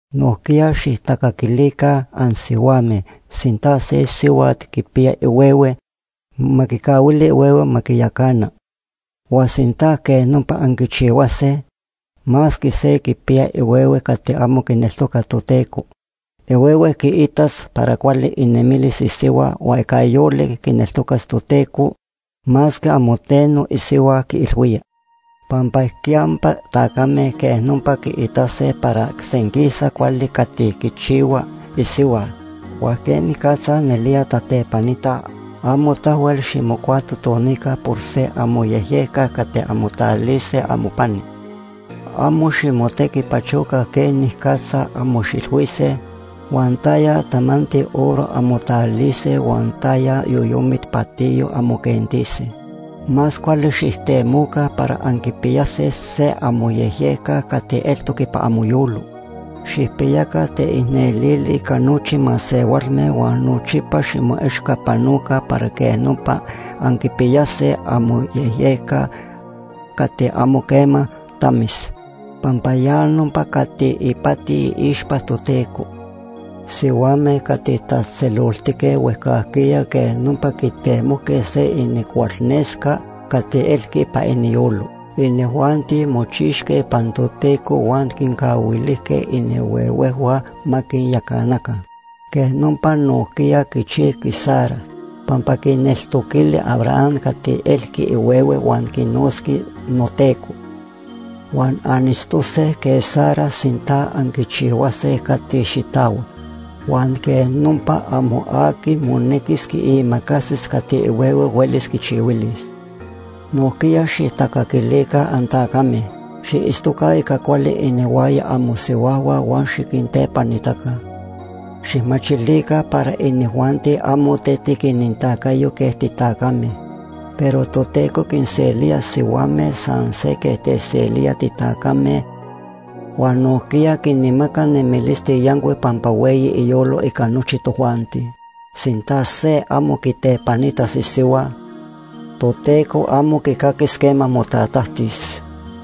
Nojquiya xijtacaquilica ansihuame. Sinta se sihuat quipiya ihuehue, ma quicahuili ihuehue ma quiyacana. Huan sinta quej nopa anquichihuase, masque se quipiya ihuehue cati amo quineltoca Toteco, ihuehue quiitas para cuali inemilis isihua huan ica yolic quineltocas Toteco masque amo teno isihua quiilhuía. Pampa ijquiyampa tacame quej nopa quiitase para senquisa cuali cati quichihuaj isihua huan quenicatza nelía tatepanitaj. Amo tahuel ximocuatotonica por se amoyejyejca cati anmotalilise amopani. Amo ximotequipachoca quenicatza anmoxilhuise, huan taya tamanti oro anmotalilise huan taya yoyomit patiyo anmoquentise. Más cuali xijtemoca para anquipiyase se amoyejyejca cati eltoc ipan amoyolo. Xijpiyaca teicnelili ica nochi masehualme huan nochipa ximoechcapanoca para quej nopa anquipiyase amoyejyejca cati amo quema tamis, pampa ya nopa cati ipati iixpa Toteco. Sihuame cati tatzejtzeloltique huejcajquiya quej nopa quitemojque se inincualnesca cati elqui ipan iniyolo. Inijuanti mochixque ipan Toteco huan quincahuilijque inihuehuejhua ma quinyacanaca. Quej nopa nojquiya quichijqui Sara, pampa quineltoquili Abraham cati elqui ihuehue huan quinotzqui “noteco”. Huan anitztose quej Sara sinta anquichihuase cati xitahuac. Huan quej nopa amo aqui monequis quiimacasis cati ihuehue huelis quichihuilis. Nojquiya xijtacaquilica antacame. Xiitztoca ica cuali inihuaya amosihuajhua huan xiquintepanitaca. Xijmachilica para inijuanti amo tetic inintacayo quej titacame, pero Toteco quinselía sihuame san se quej techselía titacame huan nojquiya quinmaca nemilisti yancuic pampa hueyi iyolo ica nochi tojuanti. Sinta se amo quitepanitas isihua, Toteco amo quicaquis quema motatajtis.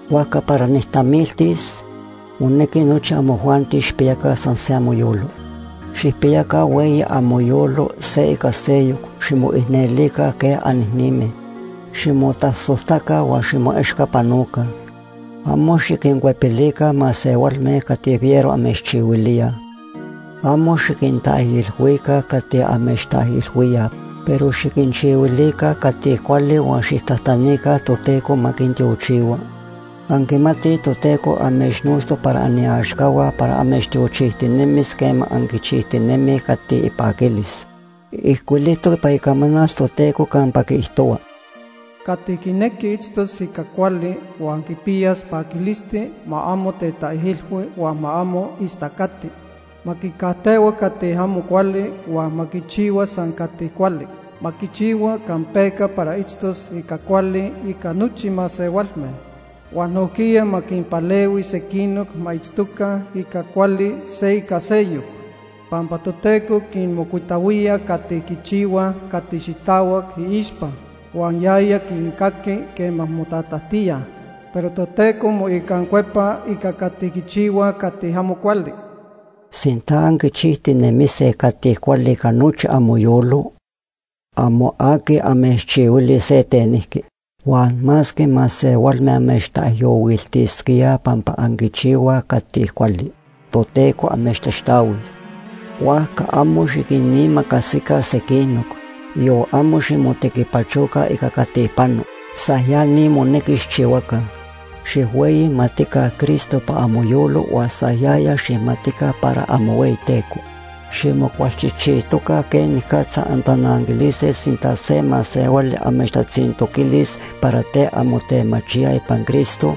Huajca para nijtamiltis, monequi nochi amojuanti xijpiyaca san se amoyolo. Xijpiyaca hueyi amoyolo se ica seyoc. Ximoicnelica quej anicnime. Ximotasojtaca huan ximoechcapanoca. Amo xiquincuepilica masehualme cati fiero amechchihuilíaj. Amo xiquintaijilhuica cati amechtaijilhuíaj, pero xiquinchihuilica cati cuali huan xijtajtanica Toteco ma quintiochihua. Anquimatij Toteco amechnotztoc para aniaxcahua para amechtiochijtinemis quema anquichijtinemij cati ipaquilis. Ijcuilijtoc ipan Icamanal Toteco campa quiijtohua: “Cati quinequi itztos ica cuali huan quipiyas paquilisti ma amo tetaijilhui huan ma amo istacati. Ma quicajtehua cati amo cuali huan ma quichihua san cati cuali. Ma quichihua campeca para itztos ica cuali ica nochi masehualme, huan nojquiya ma quinpalehui sequinoc ma itztoca ica cuali se ica seyoc. Pampa Toteco quinmocuitahuía cati quichihuaj cati xitahuac iixpa, huan yaya quincaqui quema motatajtíaj. Pero Toteco moicancuepa ica cati quichihuaj cati amo cuali.” Sinta anquichijtinemise cati cuali ica nochi amoyolo, amo aqui amechchihuilis se tenijqui. Huan masque masehualme amechtaijyohuiltisquíaj pampa anquichihuaj cati cuali, Toteco amechtaxtahuis. Huajca amo xiquinimacasica sequinoc, yon amo ximotequipachoca ica cati pano. San ya ni monequi xijchihuaca. Xijhueyimatica Cristo ipan amoyolo huan san yaya xijmatica para amohueyiTeco. Ximocualchijchijtoca quenicatza antananquilise sinta se masehuali amechtatzintoquilis para ten anmotemachíaj ipan Cristo,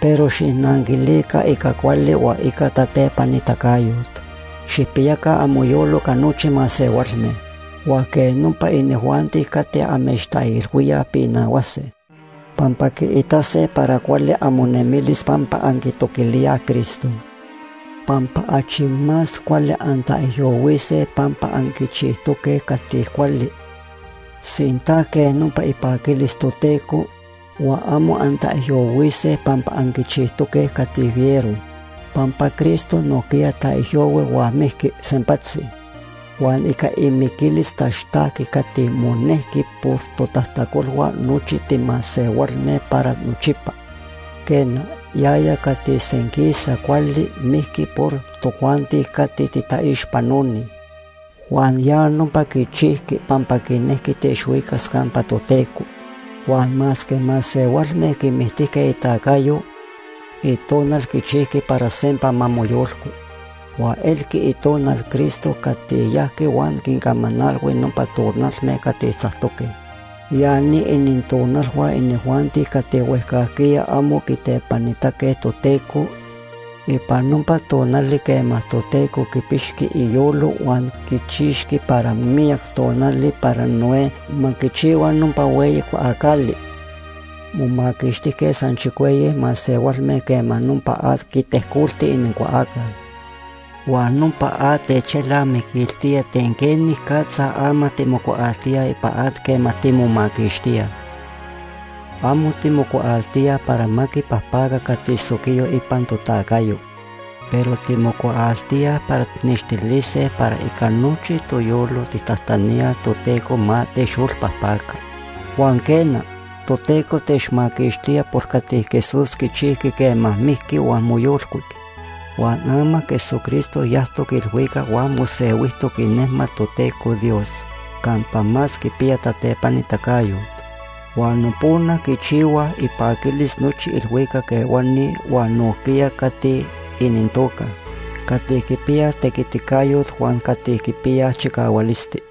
pero xijnanquilica ica cuali huan ica tatepanitacayot. Xijpiyaca amoyolo ica nochi masehualme, huan quej nopa inijuanti cati amechtaijilhuíaj pinahuase, pampa quiitase para cuali amonemilis pampa anquitoquilíaj Cristo. Pampa achi más cuali antaijyohuise pampa anquichijtoque cati cuali, sinta quej nopa ipaquilis Toteco, huan amo antaijyohuise pampa anquichijtoque cati fiero. Pampa Cristo nojquiya taijyohui huan mijqui sempatzi, huan ica imiquilis taxtajqui cati monejqui por totajtacolhua nochi timasehualme para nochipa. Quena, yaya cati senquisa cuali mijqui por tojuanti cati titaixpanoni, huan ya nopa quichijqui pampa quinejqui techhuicas campa Toteco. Huan masque masehualme quimictijque itacayo, itonal quichijqui para sempa ma moyolcui. Huan elqui itonal Cristo cati yajqui huan quincamanalhui nopa tonalme cati tzactoque. Ya ni inintonalhua inijuanti cati huejcajquiya amo quitepanitaque Toteco ipan nopa tonali quema Toteco quipixqui iyolo huan quichixqui para miyac tonali para Noé ma quichihua nopa hueyi cuaacali. Momaquixtijque san chicueyi masehualme quema nopa at quitejcolti inincuaacal. Huan nopa at techelnamiquiltía ten quenicatza ama timocuaaltíaj ipan at quema timomaquixtíaj. Amo timocuaaltíaj para ma quipajpaca cati soquiyo ipan totacayo, pero timocuaaltíaj para tijnextilise para ica nochi toyolo tijtajtaníaj Toteco ma techyolpajpaca. Huan quena, Toteco techmaquixtía por cati Jesús quichijqui quema mijqui huan moyolcuic. Huan ama Jesucristo yajtoc ilhuicac huan mosehuijtoc inejmat Toteco Dios campa más quipiya tatepanitacayot. Huan nopona quichihuaj ipaquilis nochi ilhuicac ehuani huan nojquiya cati inintoca “cati quipiyaj tequiticayot” huan “cati quipiyaj chicahualisti”.